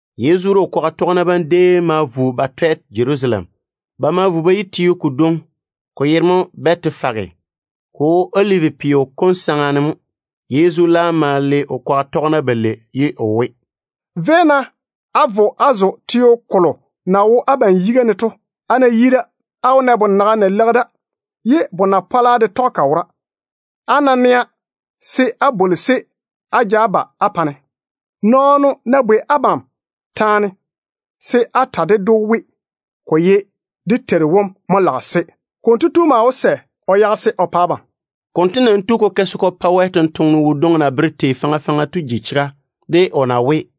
Yezu de o kwaga tɔgena bam déem ma vo ba twɛ Jerusalem. Ba ma yi teo kodwoŋi, ko yere mo Bɛtefage. Ko wo Olivi peo kom saŋa ne mo. Yezu laam ma le o kwaga tɔgena balei ye o we, “Véi-na á vo á zo teo kolo na wo abam yiga ne to. Á ná yi da, á wó na bonaga na leigi da, ye bona-pɔla de tɔge ka wora. Á ná nɛa, se á bwoli-se á ja ba á pa-ne. Nɔɔno ná bwei abam taane, se á ta ded‑o we, ko ye dé Teiru wom mo lage-se. Konto tu laam wó sɛ o yage-se o pa abam.” Konto nam tu ko ke se ko pa Wɛ sampwora kadwoŋi na bere tei faŋa faŋa to ji chega, de o na we: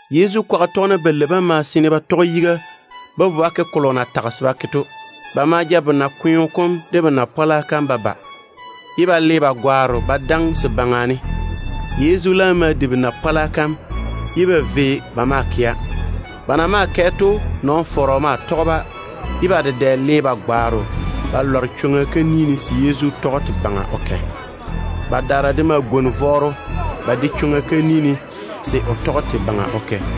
Yezu kwaga tɔgena balei bam ma seene ba tɔge yiga ba vo ba ke kolo o na tage se ba ke to. Ba ma ja bona-kweo kom de bona-pɔla kam ba ba, ye ba lɔɔre ba gwaaro ba daŋe se baŋa ne. Yezu laam ma di bona-pɔla kam, ye ba vei ba maa kɛa. Ba na maa kɛ to, kɔ-fɔrɔ ma tɔge-ba, ye ba dedɛ le ba gwaaro ba lware chwoŋa kam ne se Yezu tɔge te baŋa ne o kɛ. Badaara de ma gwoni vɔɔro ba de chwoŋa kam ne se o tɔge te baŋa ne o kɛ.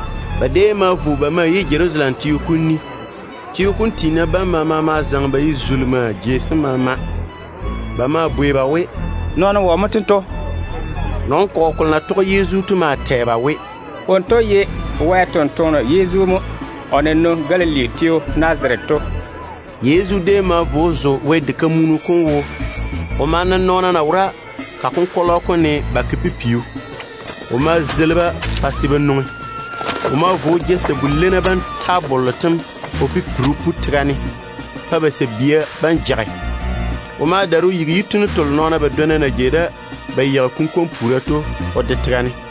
Ba déem ma vo ba yi Jerusalem teo kom ni. Teo kom tiina bam maama ma zaŋe ba ye zulimaa jei sem maama. Ba maa bwei ba we, “Nɔɔno wɔ mo tento?” Nɔn-kɔgɔ kolo na tɔge Yezu to maa tɛ ba we, “Wonto ye Wɛ ni-jwoŋinu Yezu mo, o na nwoŋi Galili teo Nazarete to.” Yezu déem ma vo o zo Wɛ diga kam. O ma na nɔɔna na wo ka konkɔlɔ kom ne ba ke pipiu. O ma zeili-ba pa se ba nwoŋi, ye o daare ja sabu-leinna tabollo tem o pipiri o pu tega ne pa ba sabia bam jage. O ma daare o yigi yitunnu telo nɔɔna badwonna na jei da ba yeigi kunkwon-puura to o de tega ne.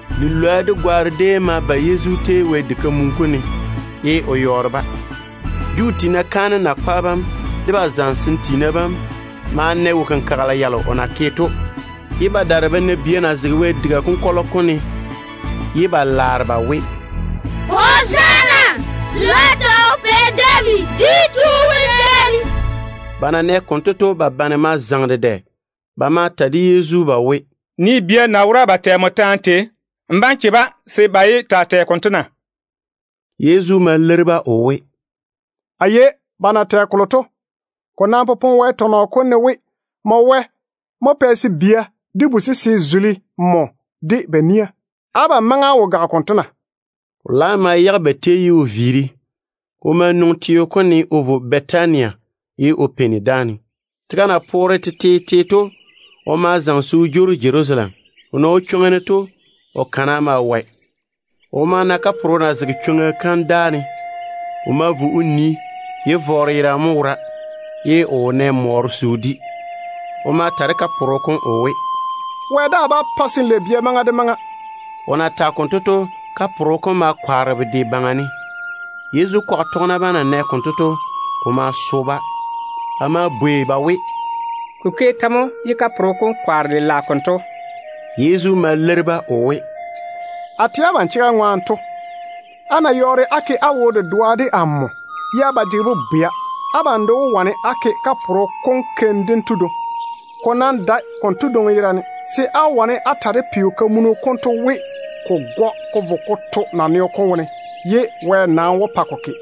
Lilwoa de gwaaro déem ma ba Yezu tei Wɛ diga konkɔlɔ kom ne, ye o yɔɔre-ba. Juu tiina kaanem yiga tiina bam de ba zamesem tiina bam ma na wo-kenkagela yalo o na ke to, ye ba daare ba na bia na zege Wɛ diga konkɔlɔ kom ne ye ba laare ba we, “Hozaana! Pɛ David dwi tu wom maŋe de tia!” Ba na nɛ konto to, ba bane ma zaŋe dedɛ. Ba ma ta de Yezu ba we, “Nii bia banto na wora ba tɛ nmo taane tei! N bá‑n che-ba se ba yé taa tɛ konto na?” Yezu ma leiri-ba o we, “A nigi ba na tɛ kolo to. Ko nam popone Wɛ tɔnɔ kom ne we, ‘Wɛ mo pɛ se bia de bu-sese taa tei o yere.’ Abam maŋe á wo gage konto na?” O laam ma viiri ba tei ne. O ma nwoŋi teo kom ne o vo Bɛtania o peini da. Tega na poore tetete to, o ma zaŋe se o jwoori Jerusalem. O na wo chwoŋa ne to, o kana maa wɔe. O ma na kaporo na zege chwoŋa kam ni ne. O ma vo o nii. Vɔɔro yerane déem mo wora, ye o wo nɛ mɔɔro se o di. O ma ta de kaporo kom o we, “Wɛ daa bá pa se n lei bia maŋa de maŋa.” O na tage konto to, kaporo kom ma kwaare bedwe baŋa ne. Yezu kwaga tɔgena bam na nɛ konto to, ko ma so-ba. Ba ma bwei ba we, “Ko ke tɛ mo ye kaporo kom kwaare lela konto?” Yezu ma leiri-ba o we, “A tɛ abam chega ŋwaane to, á ná yɔɔre á ke á wo-dedoa de Wɛ ye á ba jege bobwea, abam de wó wane á ke kaporo kom keim dento dwoŋi. Ko nam dae konto dwoŋi yerane, se á wó wane á ta de peo-kamunu konto we, ko gɔ ko vo ko to naneo kom wone, ye Wɛ nam wó pa ko ke.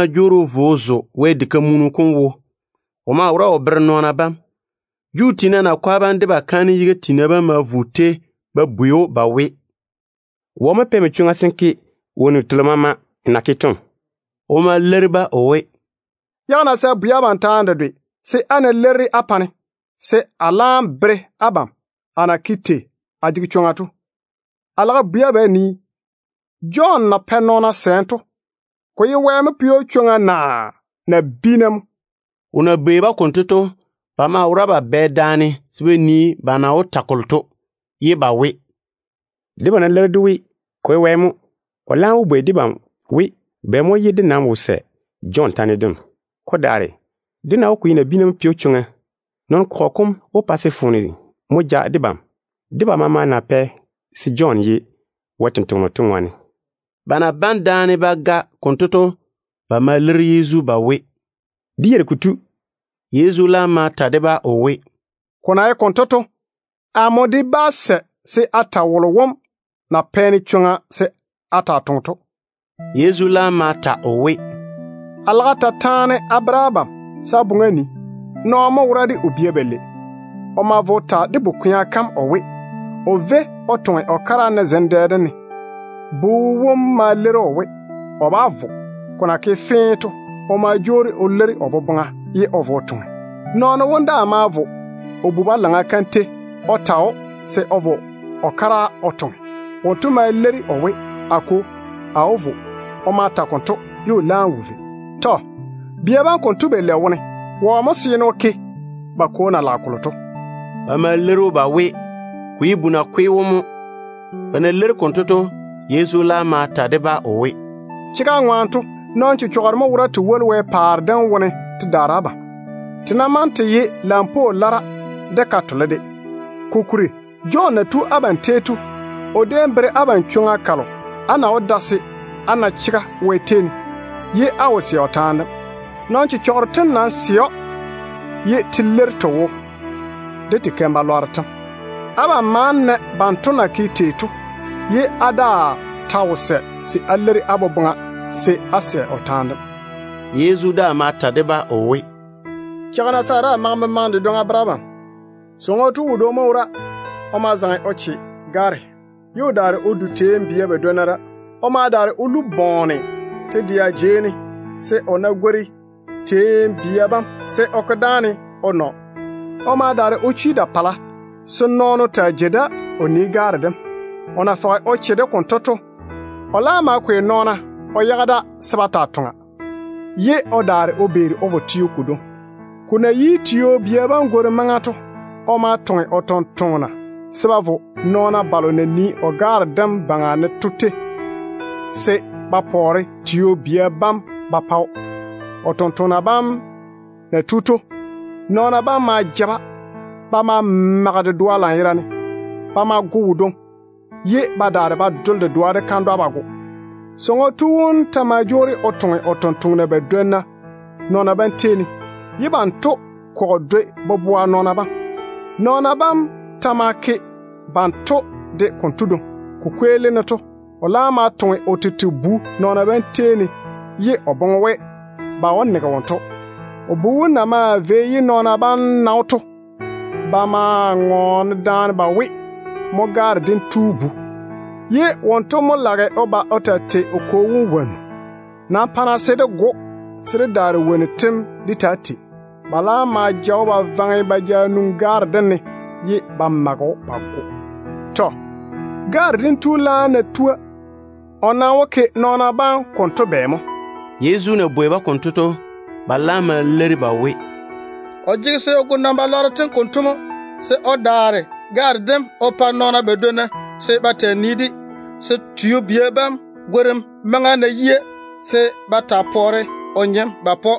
Yezu déem ma jwoori o vo o zo Wɛ diga kam. O maa wora o bere nɔɔna bam. Juu tiina nakwa bam de ba kaanem yiga tiina bam ma vo o tei ba bwei‑o ba we, “Wɔ mo pɛ nmo chwoŋa se n ke wonnu telo maama n na ke to?” O ma leiri-ba o we, “Yage-na se a bwei abam taane dedwe se, á ná leiri-de á pa-ne, se a laam bere abam amo na ke tei a jege chwoŋa to. A lage a bwei abam a nii, Jɔn na pɛ nɔɔna sɛɛm to, ko ye Wɛ mo pɛ‑o chwoŋa naa nabiina mo?” O na bwei-ba konto to, ba maa wora ba bane daane se ba nii ba na wó ta kolo to, ye ba we, “Debam ná leiri dé we, ko ye Wɛ mo, o laam wó bwei debam we, bɛ mo ye dé nam wo sɛ Jɔn taane dem? Ko daare, dé ná we ko ye nabiina mo pɛ‑o chwoŋa, nɔn-kɔgɔ kom wó pa se foone mo ja debam, de ba maama na pɛ se Jɔn ye Wɛ sampwora to ŋwaane.” Ba na bane daane ba ga konto to, ba ma leiri Yezu ba we, “Dé yeiri kotu.” Yezu laam ma ta de-ba o we, “Ko na ye konto to, amo de nam bá ta wolo na pɛ-ne chwoŋa se a taa toŋe to.” Yezu laam ma ta o we, “A lage a ta taane a bere abam se á boŋe á nii. Nɔɔno mo wora de o bia balei. O ma vo o ta de bu-kwea kam o we, o véi o toŋe o kara ne zem dɛ dem ne. Bu wom ma leiri‑o o we, o bá vo. Ko na ke fee to, o ma jwoori o leiri o boboŋa ye o vo o toŋe. Nɔɔno wom daa ma vo nyaane wom tei o ta‑o se o de vo o kara o toŋe. Wonto ma leiri o we, ‘A kwo, a wó vo.’ O ma ta konto ye o laam wo vei. Tɔ. Bia bam konto balei wone wɔ mo seene o ke ba kwo na lage kolo to?” Ba ma leiri‑o ba we, ko ye bu nakwe wom mo. Ba na leiri konto to, Yezu laam ma ta de-ba o we, “Chega ŋwaane to, nɔn-chechɔgero mo wora te woli Wɛ paare dem wone te daare abam, ba ná maŋe ba ye lampwoo lara de ka-bworru de. Kokuri Jɔn na tu abam tei to, o déem bere abam chwoŋa kalo á na wó da se á na chega Wɛ tei ne, ye á wo sɛ o taane dem. Nɔn-chechɔgero tem nam sɛ‑o ye te leiri te wo de te keim-balwaaro tem. Abam ma na banto na ke tei to, ye á daa ta wo sɛ se á leiri á boboŋa se á sɛ o taane dem.” Yezu daa ma ta de-ba o we, “Cheigi-na se a daa maŋe memaŋe dedwoŋi a bere abam. Sɔŋɔ tu wodwoŋi mo wora. O ma zaŋe o che gaare, ye o daare o jeiri Vini teeni de wone. O ma ko gwoŋo te-dɛa jei ne se o ná gwori teeni bia bam, se o ke dáane o nɔ o ŋoke te nyoa bam. O ma daare o chwi da-pala se nɔɔno taa jei da o yere gaare dem. O na fɔge o che-de konto to, o laam ma kwei nɔɔna o yage da se ba taa toŋa, ye o beeri o vo teo kodwoŋi. Tio-bia gworim maŋa na yi to, o ma toŋe o tontoŋena se ba vo nɔɔna balo na nii o gaare dem baŋa ne to tei se ba pɔɔre tio-bia bam wone ba pa‑o. O tontoŋena bam na yi da to, nɔɔna bam ma ja-ba. Ba ma mage dedoa lanyerane. Ba ma go wodwoŋi, ye ba daare ba dole dedoa de kandwa. Sɔŋɔ tu wom ta ma jwoori o toŋe o tontoŋena badwonna nɔɔna bam tei ne, ye banto kɔgɔ dwoi boboa nɔɔna bam. Nɔɔna bam ta ma ke banto de konto dwoŋi. Ko kweelim ne to, o laam ma toŋe o tete bu nɔɔna bam tei ne, ye o boŋe we, ba wó nege wonto. O bu wom na maa vei ye nɔɔna bam na‑o to, ba maa bane daane ba we, ‘Mo gaare dem tu bu-kwea kam, ye wonto mo lage o ba o taa tei o kwo wom wonnu. Nam pa-na se dé go‑o, se dé daare wonnu tem dé taa tei.’ Ba laam ma ja‑o ba vaŋe ba ja nwoŋi gaare dem ne, ye ba mage‑o ba go. Tɔ. Gaare dem tu wom laam ná tua, o nam wó ke nɔɔna bam konto bɛ mo?” Yezu na bwei-ba konto to, ba laam ma leiri ba we, “O jege se o go nɔn-wo-korro tem konto mo, se o daare gaare dem o pa nɔɔna badwonna se ba taa nii-de, se tio-bia bam gworim maŋa ná yia, se ba taa pɔɔre o nyem ba pa‑o.”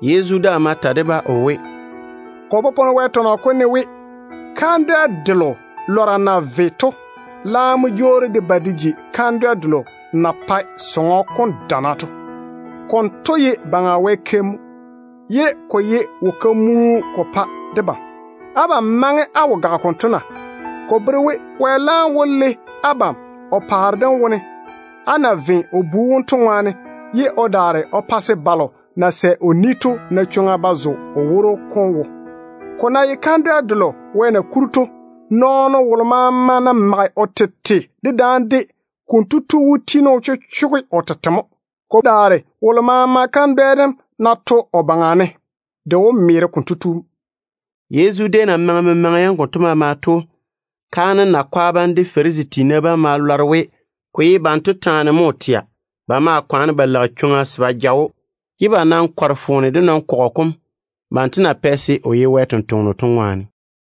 Yezu ma ta de-ba o we, “Ko popone Wɛ tɔnɔ kom ne we: ‘Kandwɛ delo lɔra na ve to laam mo jwoori de ba de ji kandwɛ delo na pae diga kam dana to. Konto ye Baŋa Wɛ keim mo. Ko maa ye wo-kenkagele ko pa debam.’ Abam maŋe á wo gage konto na? Ko bere we Wɛ laam wó le abam o paare dem wone, á na ve o Bu wom to ŋwaane, ye o daare o pa se balo na sɛ o ni to na chwoŋa ba zo o woro kom wo. [ Ko ná ye kandwɛ delo Wɛ na kuri to, nɔɔno wolo maama ná mage o tete dedaane de, konto tu wó tiini o chochoge o tete mo. Ko daare wolo maama kandwɛ dem ná to o baŋa ne, de wó meere konto tu mo.]” Yezu déem na maŋe memaŋa yam konto maama to, kaanem yiga tiina bam de Farisi tiina bam ma lɔre we ko ye banto taane mo o tɛa. Ba ma kwaane ba lage chwoŋa se ba ja‑o, ye ba laam kɔre foone de nɔn-kɔgɔ kom, banto na pɛ se o ye Wɛ sampwora to ŋwaane.